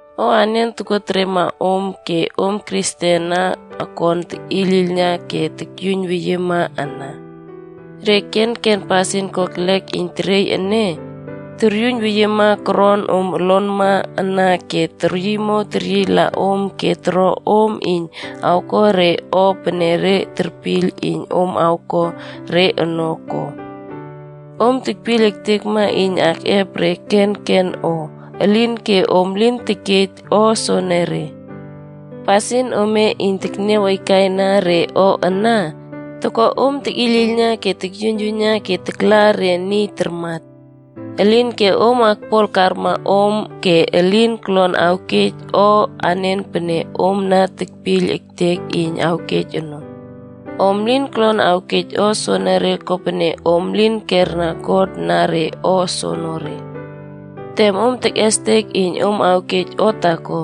O anen tokoteriema om ke om Kristen ana akon tekꞌiyliylna ke tokyuiynweyiema ana? Re kenken pasin kokelek iyn teriey ene toryuiynweyiema koron om olonma ana ke teryiymow teryiyla om ke toro om iyn awko re o pene re terpiyl iyn om awko re ono ko? Om tekpiyl ektekma iyn akꞌep re kenken o, elinke om elin tekej o soenere. Pasin ome iyn tekniaw aikaina re o ana, toko om tekꞌiyliylna ke tokyuiyn ke takla re niy tarmat. Elinke om akpol karma om ke elin kolon awkej o anen pene om na tekpiyl ektek iyn awkej ono. Om lin kolon awkej o soonore kopene om lin kerna God na o soonore. Tem om tekꞌestek iyn om awkej o taako,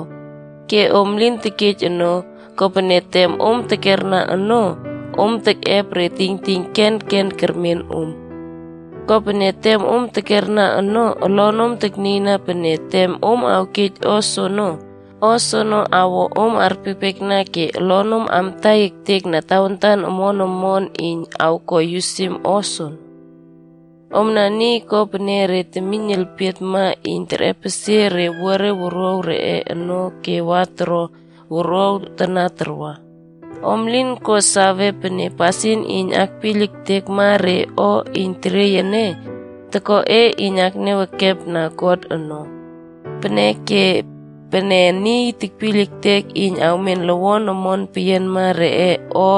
ke om lin tekej ono, kopene tem om tekera ono, om tekꞌep re tingting kenken termen om. Kopene tem om tekerna ono, olonom teknieyna pene, tem om awkej o soono, o soono awo om arpiekpiekna ke olonom amtai ektekna re tawantan omon omon iyn awko yusim o soono. Omna niy ko pene re temiyn elpietma iyn terꞌepesie re owuare wuruaw reꞌe ono ke wa toro wuruaw tana tarwa. Om lin ko sawe pene pasin iyn akpiyl ektekma re o iyn teriey ene, toko e iyn tekniaw ekepna God ono? Peneke, pene niy tekpiyl iyn awmen lowon omon peyianma reꞌe o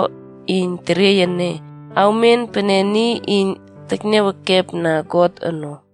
iyn teriey ene, awmen pene niy iyn tekniaw ekepna God ono.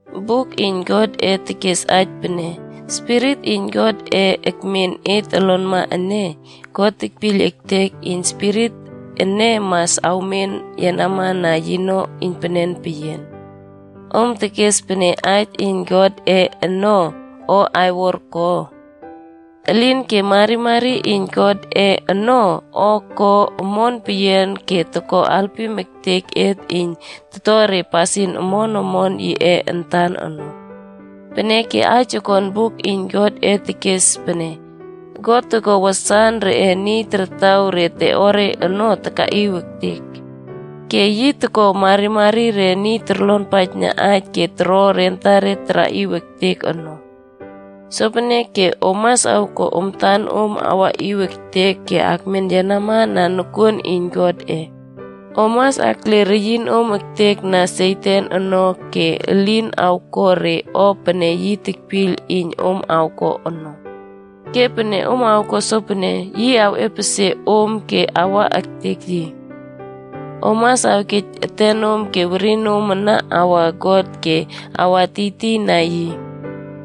Buk iyn Godꞌe tekes aij pene, “Spirit iyn Godꞌe akmen et olonma ene, God tekpiyl ektek iyn spirit ene mas awmen yenama na yino iynpenen peyian.” Om tekes pene aij iyn Godꞌe ono o aiwor ko? Elinke marimari iyn Godꞌe ono o ko omon peyian ke toko alpim ektek et iyn toto re pasin omon omon yiꞌe antan ono. Peneke aij okon buk iyn Godꞌe ono tekes pene, “God toko wasan reꞌe niy tartaw re teꞌore ono takaꞌiw ektek. Ke yi toko marimari re niy torlonpaijna aij ke toro re antare taraꞌiw ektek ono.” Sopeneke om mas awko om antanom awkaꞌiw ektek ke akmen yenama na nokuon iyn Godꞌe. Om mas akle reyinom ektekna Satan ono ke elin awko re o pene yi tekpiyl iyn om awko ono. Ke pene om awko sopene, yi awꞌepesie om awa ektek yi. Om mas awkej etenom ke werinom ome ana awana God ke akwa tiytiy na yi.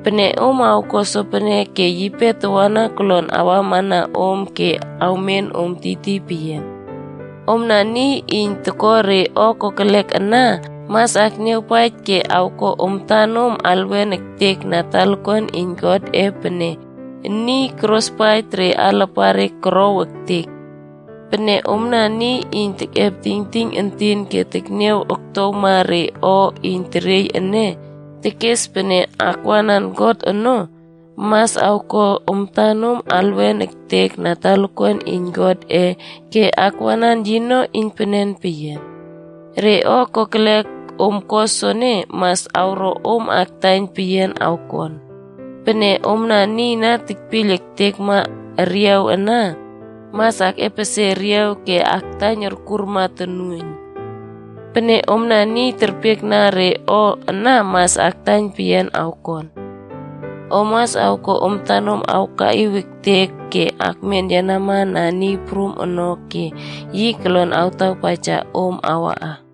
Pene om awko sopene ke yipe tawana kolon awamana om ke awmen om tiytiy peyian. Omna niy iyn toko re o kokelek ana mas akniawpaij ke awko om antanom alwen ektekna talakuan iyn Godꞌe pene niy korospaij re alapare korkow ektek. Pene omna niy iyn tekꞌep tingting entin ke teknia oktowma re o iyn teriey ene tekes pene akwanan God ono, mas awko om antanom alwen ektekna talakuan iyn Godꞌe ke akwanan yino iynpenen peyian. Re o kokelek om ko soene, mas awro om aktaiyn peyian awkon. Pene omna niy na tekpiyl ektekma eriaw ana, mas akꞌepesie eriaw ke aktaiyn orkurma tonuoiyn. Pene omna niy terpiekna re o ana mas aktaiyn peyian awkon. Om mas awko om antanom awkaꞌiw ektek ke akmen yenama na Niy Prum ono ke yi kolon awtapaija om awkaꞌa.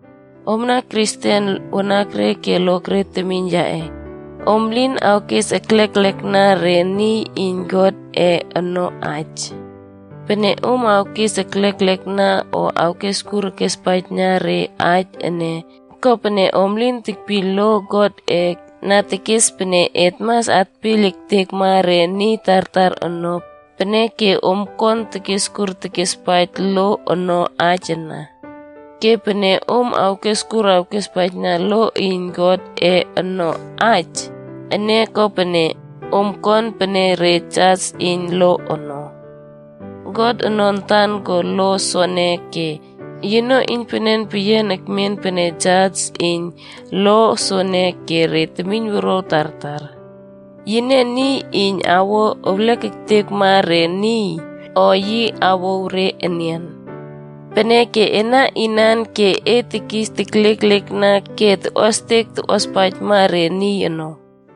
Omna Kristen wanakre ke lokre temiyn yaꞌe, om lin awkes ekleklekna re niy iyn Godꞌe ono aij. Pene om awkes ekleklekna o awkeskur awkespaijna re aij ene, kopene om lin tekpiyl lo Godꞌe na tekes pene et mas atpiyl ektekma re niy tartar ono, peneke om akon tekeskur tekespaij lo ono aij ana. Ke pene om awkeskur awkespaijna lo iyn Godꞌe ono aij, ene ko pene, om kon pene re jas iyn lo ono. God ono antan ko lo soene ke yino iynpenen peyian ekmen pene jas iyn lo soene ke re temiynwuruaw tartar. Yine niy iyn awo ewlek ektekma re niy o yi awouw re enian. Peneke ena inan e ke e na tekis tekliekliekna ke tokꞌuastek tokꞌuaspaijma re niy ono?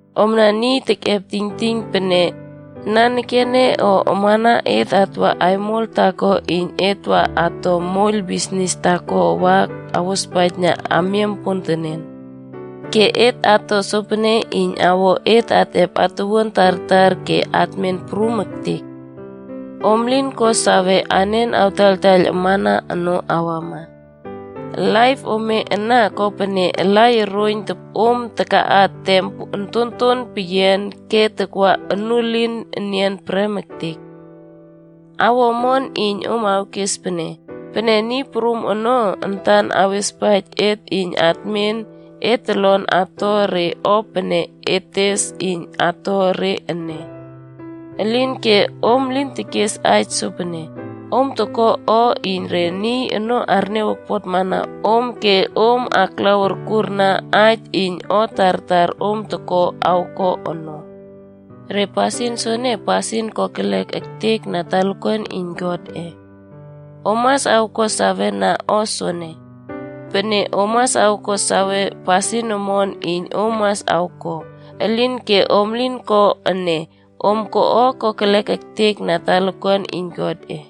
Omna niy tekꞌep tingting pene, “Nanekene o amana et atwa aimol taako iyn et ato moiyl bisnis taako wa awospaijna amiam pontenen. Ke et ato sopene iyn awo et atꞌep atuwuan tartar ke atmin prum ektek.” Om lin ko sawe anen awtaiyltaiyl amana ono awama. Laip ome ana, kopene alai oroiyn topꞌom takaꞌa tem ontonton peyian ke takwa onuelin enian prem ektek. Awo omon iyn om awkes pene, “Pene Niy Prum ono antan awespaij et iyn atmen, et tolon ato re o pene et tes iyn ato re ene.” Elinke om lin tekes aij sopene, om toko o iyn re niy ono arniaw okpotmana om ke om taklaw urkurna aij iyn o tartar om toko awko ono. Ke pasin soene, pasin kokelek ektek na talakuan iyn Godꞌe. Om mas awko sawena o soene. Pene om ko sawe pasin omon iyn om mas awko, elinke om lin ko ene, om ko o kokelek ektekma na talakuan iyn Godꞌe.